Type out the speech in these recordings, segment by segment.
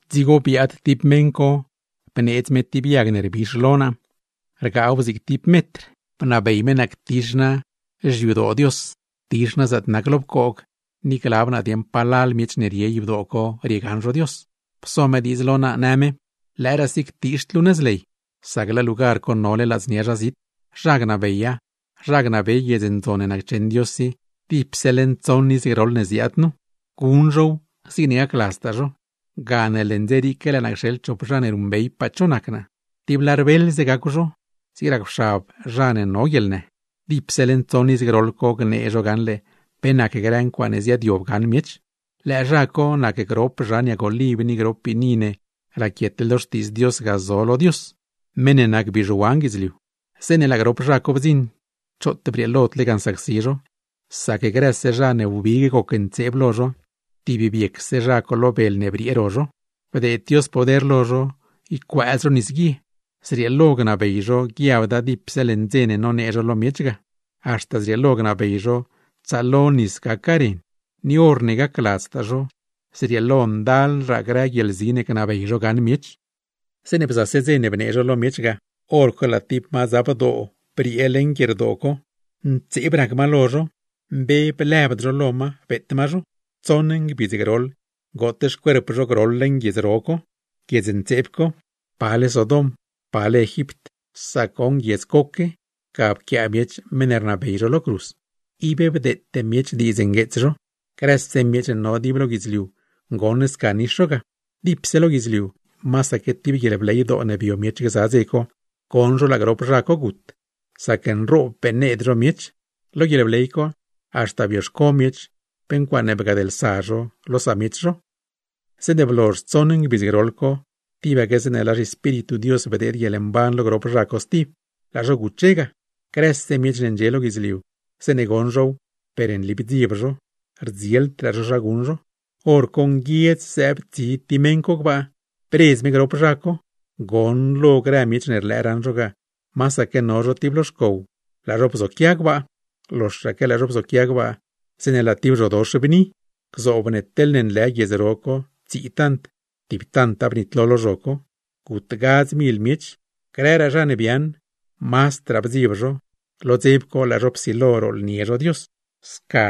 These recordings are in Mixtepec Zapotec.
Dzigo biaad tib meṉ co bneedz me tib yag ne rbix lo naa, rgaaw zig tib metr, bnabey me naa ctix naa xyadoo Dios, ctix naa zaatne nac lo pcoog, ni glab naa dieṉ palal miech ne rie yadoo co riegaṉ zho Dios. Pso me diidz lo naa, në me: ―Lëëraasi ctiixd luu nëz ley, sac laa lugar co nole ladznia zha zit; zha gnabeya, zha gnabey guiedz ndzon ne naccheṉ Dios i; dipse leṉ tsoṉ iz groḻ ne ziaad nu, guṉ zhow zigne gacladztaa zho. Gane leṉ dze riique laa naa cxeḻ chop zha ne ruṉbeypaa cho nac naa, tib lar beeḻze gacw zho, zig racwxab zha ne no guieḻnë; dipse leṉ tsoṉ iz groḻ co gnee zho gaṉle pe nac grë ncuaaṉe ziaadyob gaṉ miech. Lëë zha co nac grop zhan yag oliv ni grop biini ne raquietle lo Xtiidz Dios ga zo lo Dios (meṉ ne nac bizhuan guidzliu). Zeeṉe laa grop zha co bdziṉ, choot brieelod lega nsacsi zho, sac grëse zha ne wbig gocntseeb lo zho, tib biecse zha co lo bel ne briee ro zho. Bdeed Dios poder lo zho ycuëëz zho nisguie, zrieelo gnabey zho guiabda dipse leṉ dze ne nonee zho lo miech ga, haxta zrieelo gnabey zho tsaalo nis gaca ren; ni horne gacladztaa zho, zrieelo ndalraa grë guieḻzi ne gnabey zho gaṉ miech. Zeeṉe bzase dze ne bnee zho lo miech ga, hor co laa tib madzabdoo briee leṉ guierdoo co; ntseeb rac ma lo zho. Mbe blëbd zho lo ma, beet ma zho. Tsoṉ ngbidz groḻ goot xcuerp zho groḻ leṉ guiedz ro co, guiedz ntseeb co. Pale Sodom, pale Egipt, sac goṉ guiedz coque, ga pquiaa miech meṉ ne rnabey zho lo cruz. Ib bdeete miech diidz ngueets zho, grëse miech ne no dib lo guidzliu goṉ sca nix zho ga; dipse lo guidzliu, masaque tib guieḻbleydoo ne bio miech gza dze co, goṉ zho laa grop zha co gut, sac nroob beṉneed zho miech. Lo guieḻbley co, haxta bioxco miech pe ncuaaṉe bgadlsa zho lo samiech zho. Zeeṉe blozh tsoṉ ngbidz groḻ co, tibaque zeeṉe laa zhiEspíritu Dios bdeed guieḻmban lo grop zha co stib, laa zho guche ga; grëse miech ne ndxie lo guidzliu, zeeṉe goṉ zhow, per nli bdzieb zho, rdzieldraa zho zha guṉ zho. Horco nguiedz zëëb tib tsi meṉ co gbaa, bredz me grop zha co. Goṉlo grë miech ne rlëë raṉ zho ga, masaque no zho tib lo xcow, laa zho bzoquia gbaa; loxaque laa zho bzoquia gbaa, zeeṉe laa tib zhodox bni. Gzoob ne teḻne nlë guiedz ro co tsii tant, tib tanta bnitlo lo zho co; gut gadz mil miech. Grëraa zha ne biaaṉ, mazdraa bdzieb zho, lo dzeb co laa zho psilo rooḻnie zho Dios. Sca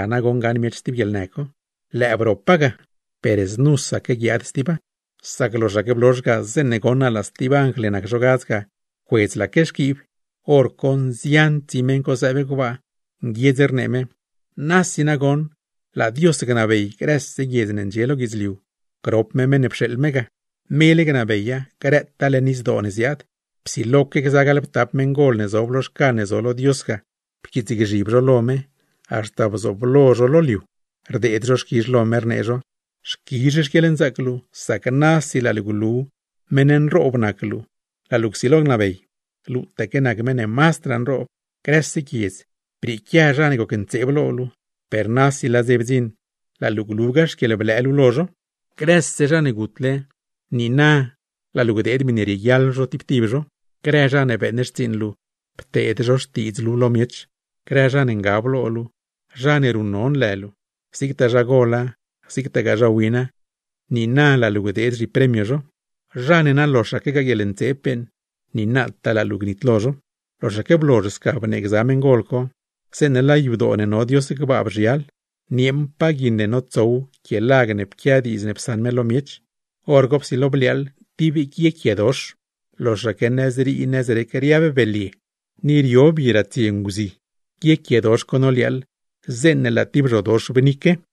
gaṉ miech stib guieḻnë co. Lëë bropa ga, per znusaque guiaad stiba. Sac loxaque blozh ga, zeeṉe goṉ naa laa stib anjl ne nac zho gadz ga, pcuedzlaque xquiib; hor co nzian tsi meṉ co zëëb gbaa, nguiedz rnee me: Nasi nagoṉ, laa Dios gnabey grëse guiedz ne ndxie lo guidzliu, grop me Meṉ ne pxeeḻ me ga. Mele gnabeya, grëtaa leṉ izdoo ne ziaad. Psiloque gza gaḻptap meṉgol ne zob lo xcan ne zo lo Dios ga, pquiitsgzhib zho lo me, haxta bzooblo zho lo liu, rdeed zho xquizh lo me, rnee zho: Xquizh xquieḻnzaac luu, sac nasi laa luu glu meṉ nroob nac luu, laa luu csilo gnabey. Luutaque nac meṉ ne mazdraa nroob. Grëse guiedz, brieequia zha ne gocntseeb lo luu; per nasi laa dze bdziṉ, laa luu glugaa xquieḻblëë luu lo zho. Grëse zha ne gutle, niina laa luu gdeed miṉe rieguiaḻ zho tib tib zho. Grë zha ne beeṉ xtsiiṉ luu, pteed zho xtiidz luu lo miech, grë zha ne ngab lo luu, zha ne ruṉnon lë luu, zigtaa zha gola, zigtagaa zha wina, niina laa luu gdeed zhipremio zho; zha ne na loxaquegaa guieḻntseeb beeṉ, niinataa laa luu gnitlo zho. Loxaque blozh sca bnee gza meṉgol co, zeeṉe laa yadoo ne no Dios gbaa bzhial, nieeṉpaa guiṉ ne notsow quie lag ne pquia diidz ne psaṉ me lo miech. Horco psilo bliaaḻ tib guiequiedox, loxaque nëzrii nëzrec riab belye, ni rio bi ratsie nguzi; guiequiedox co noliaaḻ, zeeṉe laa tib zhodox bnique.